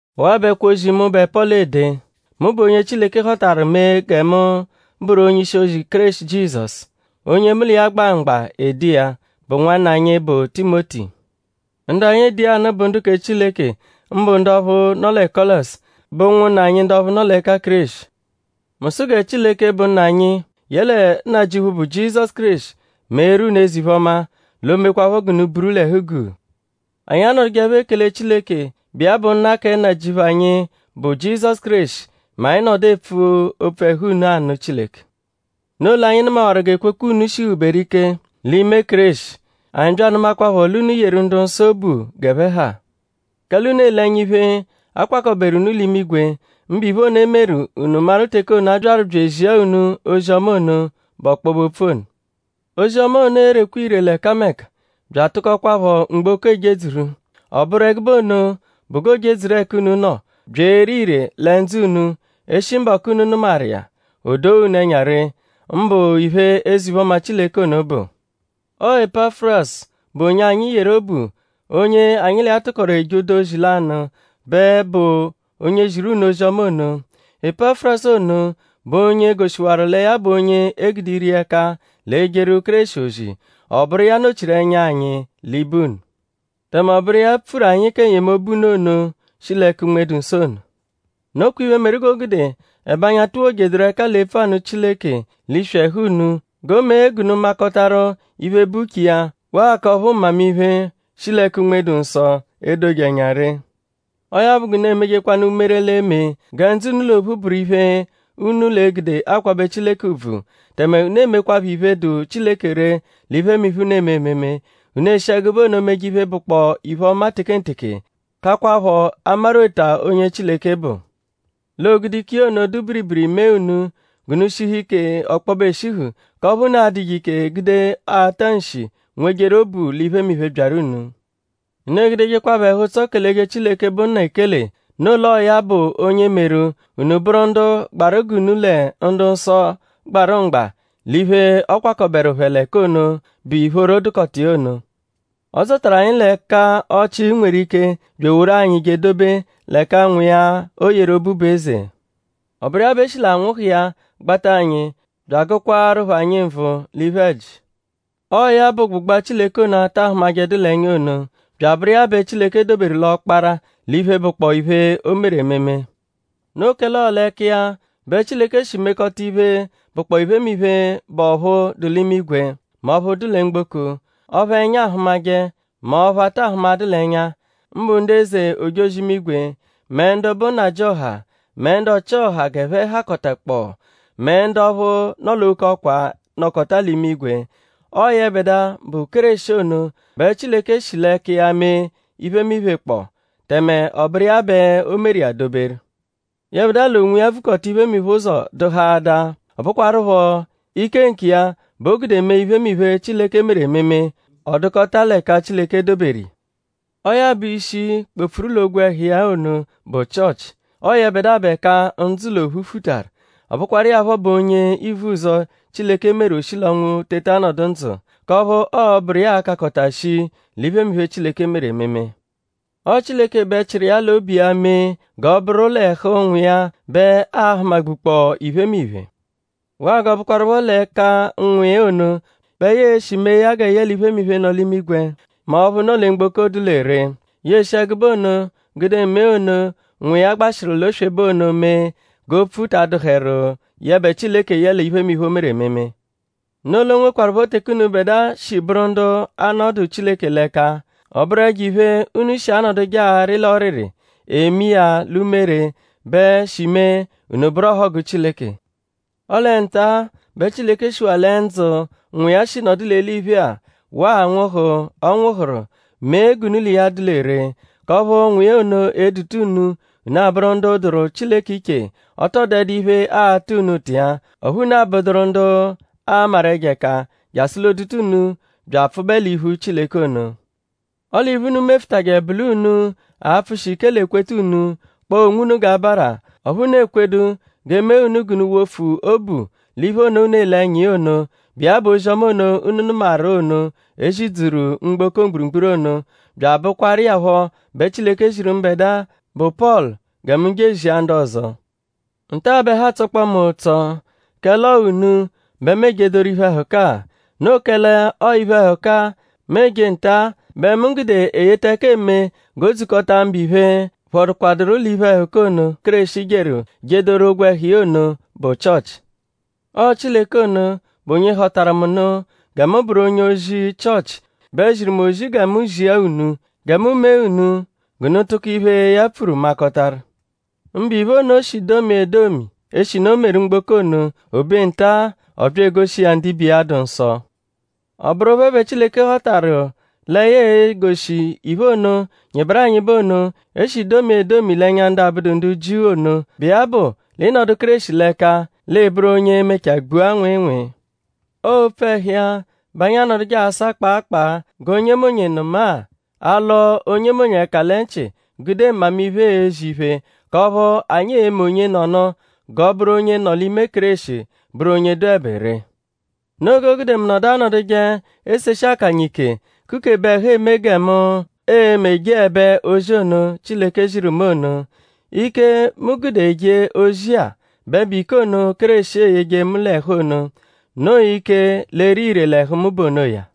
Ọwa-a bụ ẹkwo-ozi, mụbe Pọlu ede. Mu bụ onye Chileke họtaru mee gẹ mu bụru onye-ishi-ozi Kéreshi Jizọsu. Onye mu l'iya gba mgba ede iya bụ nwanna anyi, bụ Timoti. Ndu anyi ede iya anụ bụ ndu kẹ Chileke; mbụ ndu ọphu nọ lẹ Kọlosi, bụ ụnwunna anyi ndu ọphu nọ l'ẹka Kéreshi. Mu sụ gẹ Chileke, bụ Nna anyi yẹle Nnajịuphu, bụ Jizọsu Kéreshi meeru unu eze-iphe-ọma; l'o mekwaaphọ g'unu buru l'ẹhu-guu. Anyi anọdujeepho ekele Chileke, bụ iya bụ Nna kẹ Nnajịuphu anyi, bụ Jizọsu Kéreshi mẹ anyi -nọdu epfu opfu ẹhu unu anụ Chileke. Noo l'anyi nụmawaru g'ekwekwe unu shihuberu ike l'ime Kéreshi. Anyi bya anụmaakwapho l'unu yeru ndu-nsọ obu g'ẹphe ha. Kẹle unu ele ẹnya iphe, a kwakọberu unu l'imigwe; mbụ iphe ono, e meru; unu maru teke ono, a byaru bya ezia unu ozi-ọma ono, bụ ọkpobe-opfu ono. Ozi-ọma ono erekwa ire l'ẹkameka bya atụkoakwapho mgboko ejedzuru. Ọ bụru ẹgube ono bụ g'o jedzuru ẹka unu nọ bya ere ire lẹ ndzụ unu e -shi mbọku, unu nụmaru iya; o doo unu ẹnya ree; mbụ iphe, eze-iphe-ọma Chileke ono bụ. Ọo Epafurasu, bụ onye anyi yeru obu; onye anyi l'iya tụkoru eje ụdu ozi lanụ bẹ bụ onye ziru unu ozi-ọma ono. Epafurasu ono bụ onye goshiwaru lẹ ya bụ onye e gude ire iya ẹka l'ejeru Kéreshi ozi; ọ bụru iya nọ-chiru ẹnya anyi l'ibe unu; tẹme ọ bụru iya pfuru anyi kẹ n-yemobu unu ono, shi l'ẹka Unme-dụ-Nsọ ono. Nokwa iphe, meru g'o gude ẹbe anyi atuwojedụru ẹka l'epfu anụ Chileke l'iswi ẹhu unu; g'o mee g'unu makọtajeru iphe, bụ uche iya; waa k'ọphu mmamiphe, shi l'ẹka Unme-dụ-Nsọ edoje ẹnya ree. Ọo ya bụ g'unu emejekwanụ umere, l'e-me gẹ ndzụ unu l'ophu bụru iphe, unu l'e-gude akwabẹ Chileke ùbvù; tẹme unu emekwaphọ iphe, dụ Chileke ree l'iphemiphe, unu eme ememe. Unu eshi ẹgube ono meje iphe, bụkpoo iphe-ọma tekenteke; kakwaphọ amarweta onye Chileke bụ. L'o gude ike iya ono, dụ biribiri mee unu g'unu shihu ike ọkpobe eshihu; k'ọphu unu a-dụje ike gude ata nshi nwejeru obu l'iphemiphe, byaru unu. Unu egudejekwaphọ ẹhu-ụtso keleje Chileke, bụ Nna ekele. Noo l'ọo ya bụ onye meru; unu bụru ndu gbaru g'unu lẹ ndu-nsọ gbarụ mgba l'iphe, ọ kwakọberu phẹ l'ẹka ono, bụ ìphóró dụkota iya ono. Ọ dzọtaru anyi l'ẹka ọchii nweru ike bya eworu anyi je edobe l'ẹka Nwa iya, o yeru obu bụ eze. Ọ bụru iya bẹ e shi l'anwụhu iya gbata anyi; bya agụkwaarupho anyi nvụ l'iphe-ẹji. Ọo ya bụ ụgbugba Chileke ono, a ta ahụmajedu l'ẹnya ono; bya abụru iya bẹ Chileke doberu l'ọkpara l'iphe, bụkpoo iphe, o meru ememe. Noo kẹle ọo l'ẹka iya bẹ Chileke shi mekọta iphe, bụkpoo iphemiphe, bụ ọphu dụ l'imigwe mẹ ọphu dụ lẹ mgboko; ọphu ẹnya ahụmaje mẹ ọphu a ta hụmadu l'ẹnya; mbụ ndu eze ojozi-imigwe; mẹ ndu bụ nnajịoha; mẹ ndu ọchi-ọha g'ẹphe hakọtakpoo; mẹ ndu ọphu nọ l'oke ọkwa, nọkota l'imigwe. Ọo yẹbedua, bụ Kéreshi ono bẹ Chileke shi l'ẹka iya mee iphemiphe kpọ; tẹme ọ bụru iya bẹ o meru iya doberu. Yẹbedua l'onwiya vukọta iphemiphe ụzo dụhaadaa. Ọ bụkwarupho ike nkiya bẹ o gude mee iphemiphe, Chileke meru ememe; ọ dụkota l'ẹka Chileke doberu iya. Ọo ya bụ ishi, kpọ-pfuru l'ogwẹhu iya ono, bụ Chịochi. Ọo yẹbedua bụ ẹka ndzụ l'ophu futaru. Ọ bụkwaru iya phọ bụ onye ivuzọ, Chileke meru o shi l'ọnwu teta nọdu ndzụ; k'ọphu ọo-bụru iya a-kakọta shii l'iphemiphe, Chileke meru ememe. Ọo Chileke bẹ chịru iya l'obu iya mee g'ọ bụru l'ẹhu Nwa iya bẹ aa-hụma-gbukpọo iphemiphe. Waa g'ọo bụkwarupho l'ẹka Nwa iya ono bẹ ya e-shi mee gẹ yẹle iphemiphe, nọ l'imigwe mẹ ọphu nọ lẹ mgboko dụ lẹ ree. Ya eshi ẹgube ono gude mee ono, Nwa iya gbashịru l'oswebe ono mee g'opfu ta adụheru yẹbe Chileke yẹle iphemiphe, o meru ememe. Noo l'o nwekwarụpho teke unubẹdua shi bụru ndu 'anọdu Chileke l'ẹka. Ọ bụru ẹjo-iphe unu shi anọduje arị l'ọriri; eme iya l'umere bẹ shi mee; unu bụru ọhogu Chileke. Ọle nta-a bẹ Chileke shiwaa lẹ ndzụ, Nwa iya shi nọdu l'eliphe-a waa anwụhu, ọ nwụhuru; mee g'unu l'iya dụ lẹ ree; k'ọphu Nwa iya ono e-duta unu; unu abụru ndu dụru Chileke iche; ọ tọ dụdu iphe, aata unu ụta iya; ọphu unu abụduru ndu aamaru ẹjo ẹka jasụ l'o duta unu bya apfụbe l'iphu Chileke ono. Ọle iphe, unu mefụtaje bụ l'unu a-pfụshi ike l'ekweta unu; kpọo onwunu g'abara; ọphu unu ekwedu g'e mee unu g'unu wofu obu l'iphe ono, unu ele ẹnya iya ono, bụ iya bụ ozi-ọma ono, unu nụmaru ono, e zidzuru mgboko mgburugburu ono; bya abụkwaru iya phọ bẹ Chileke ziru mbẹdua, bụ Pọlu gẹ mu je ezia ndu ọzo. Nta-a bẹ ẹhu atsọkpoo mu ụtso; kẹle ọo unu bẹ mu ejedoru iphe-ẹhuka-a. Noo kẹle ọo iphe-ẹhuka-a, mu eje nta-a bẹ mu gude eyeta ẹka eme g'o dzukọta mbụ iphe, phọdukwaduru l'iphe-ẹhuka ono, Kéreshi jeru jedoru ogwẹhu iya ono, bụ Chịochi. Ọo Chileke ono, bụ onye họtaru mu nụ gẹ mu bụru onye-ozi Chịochi bẹ ziru mu ozi gẹ mu zia unu; gẹ mu mee unu g'unu tụko iphe, ya pfuru makọtaru; mbụ iphe ono, o shi domia edomi eshinu o meru mgboko ono. O be nta ọ bya egoshi iya ndibe iya, dụ nsọ. Ọ bụru phẹ bẹ Chileke họtaru lẹ ya e-goshi iphe ono, nyịberu anyịbe ono, e shi domia edomi l'ẹnya ndu abụdu ndu Jiu ono, bụ iya bụ l'ị -nọdu Kéreshi l'ẹka; l'ịi bụru onye e-mechaa gbua nwịinwii. Ọo opfu ẹhu iya bẹ anyi anọduje asa kpaa kpaa g'onyemonye nụma-a; alọ onyemonye ẹka lẹ nchị gude mmamiphe ezi iphe k'ọphu anyi e-me onyenọnu g'ọ bụru onye nọ l'ime Kéreshi bụru onye dụebe ree. Noo g'o gude mu nọdu anọduje eseshi akanya ike; kukebe ẹhu eme gẹ mu e-me jeẹbe ozi ono, Chileke ziru mu ono. Ike, mu gude eje ozi-a bẹ bụ ike ono, Kéreshi eyeje mu l'ẹhu ono. Noo ike, l'ere ire l'ẹhu mu bụ onoya.